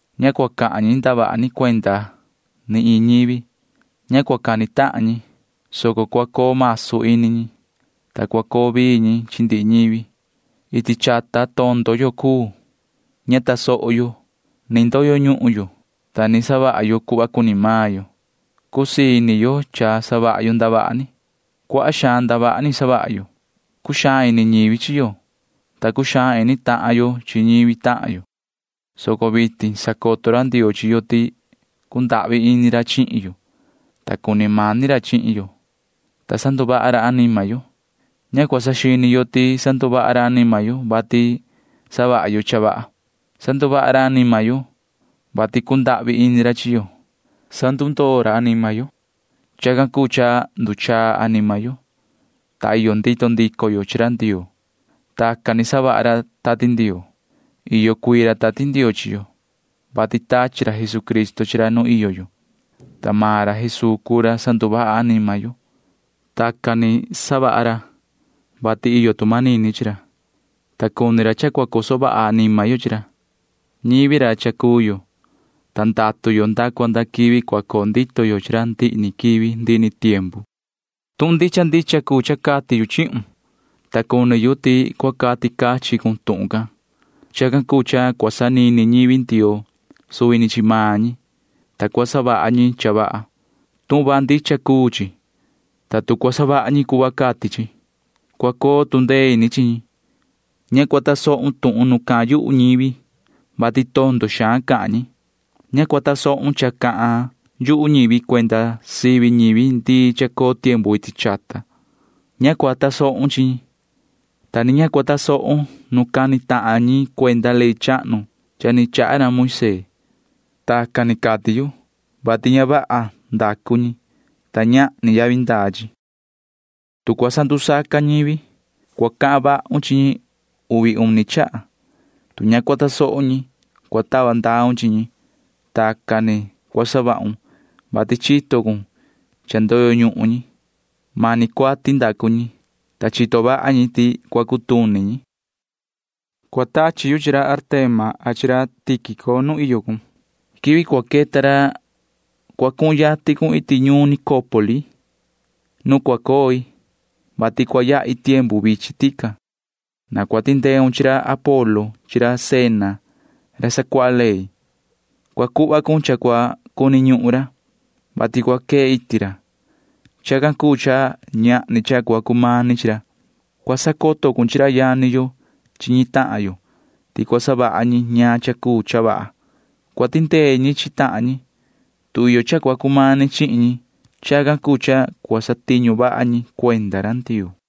Ña cua cahan ñi ndavaha ni cuenda ni iin ñivi. Ña cua cani tahan ñi, soco cua coo masu ñi, ta cua coo vii ñi chi ndihi ñivi. Iti chata tondo yo cuu. Ña tuhva yo tasoho yo. Cha ndoyo ñuhun yo, ta cha savaha yo cuhva cuni maan yo. Cha cusii ini yo savaha yo ndavaha ni. Cuaha xaan ndavaha ni savaha yo, ta ña cuu saña yo. Cuxaan ini ñivi chi yo, ta cuxaan ini tahan yo chi ñivi tahan yo, soco vitin sacoto ra Ndioo chi yo ti cundahvi ini ra chihin yo, ta cuni mani ra chihin yo, ta sanduvaha ra anima yo. Ña cua saxini yo ti sanduvaha ra anima yo, vati savaha yo cha vaha. Sanduvaha ra anima yo, vati cundahvi ini ra chi yo. Sandundoo ra anima yo. Chacan cuu cha nduchaa anima yo, ta iyo ndito ndico yo chi ra Ndioo. Tacan ni savaha ra Tati Ndioo. Iyo cuii ra Tati Ndioo chi yo, vati tachi ra Jesucristo chi ra nu iyo yo, ta maan ra Jesuu cuu ra sanduvaha anima yo. Tacan ni savaha ra, vati iyo tu manini chi ra, ta cuni ra cha cua coso vaha anima yo chi ra. Ñivi ra cha cuu yo, ta ndatu yo nda cua nda quivi cua coo ndito yo chi ra ndihi ni quivi ndihi ni tiempu. Tuhun ndicha ndicha cuu cha cati yu chihun, ta cuni yu ti cua cati cachin cun tuhun can. Chacan cuu cha cua sanini ñivi Ndioo suvi ni chi maan ñi, ta cua savaha ñi cha vaha. Tuhun vaha ndicha cuu chi, ta tu cua savaha ñi cuhva cati chi, cua coo tu ndee ini chi ñi. Ña cua tasohun tuhun nu cahan yuhu ñivi, vati tondo xaan cahan ñi. Ña cua tasohun cha cahan yuhu ñivi cuenda sivi ñivi ndii chahnu. Ña cua tasohun cha cahan yuhu ñi, ta ni ña cua tasohun nu cani tahan ñi cuenda ley chahnu cha ni chaha ra Moisee. Tacan ni cati yu, vati ña vaha ndacu ñi, ta ñahni yavi ndaa chi. Tu cua sandusaca ñivi, cua cahan vahun chi ñi uvi uni chaha. Tu ña cua tasoho ñi, cua tava ndaun chi ñi. Tacan ni cua savahun, vati cua nihun cuhva ti cha ndoyo ñuhun ñi. Mani cuati ndacu ñi, ta chito vaha ñi ti cua cutuni ñi. Cua tachi yu chi ra Artema a ra Tíquico nu iyo cun. Quivi cua queta ra cua cuhun yatin cun iti ñuun Nicópoli nu cua coi, vati cua yahi tiempu vichin tican. Na cua tindeun chi ra Apolo chi Zena ra sacuaha ley. Cua cuhva cun cha cua cuni ñuhun ra, vati cua quee iti ra. Chacan cuu cha ñahni cha cua cumani chi ra. Cua sacoto cun chi ra yani yo chi ñi tahan yo ti cua savaha ñi ñaan cha cuu cha vaha. Cua tindee ñi chi tahan ñi, tu iyo cha cua cumani xaan chihin ñi. Chacan cuu cha cua satiñu vaha ñi cuenda ra Ndioo.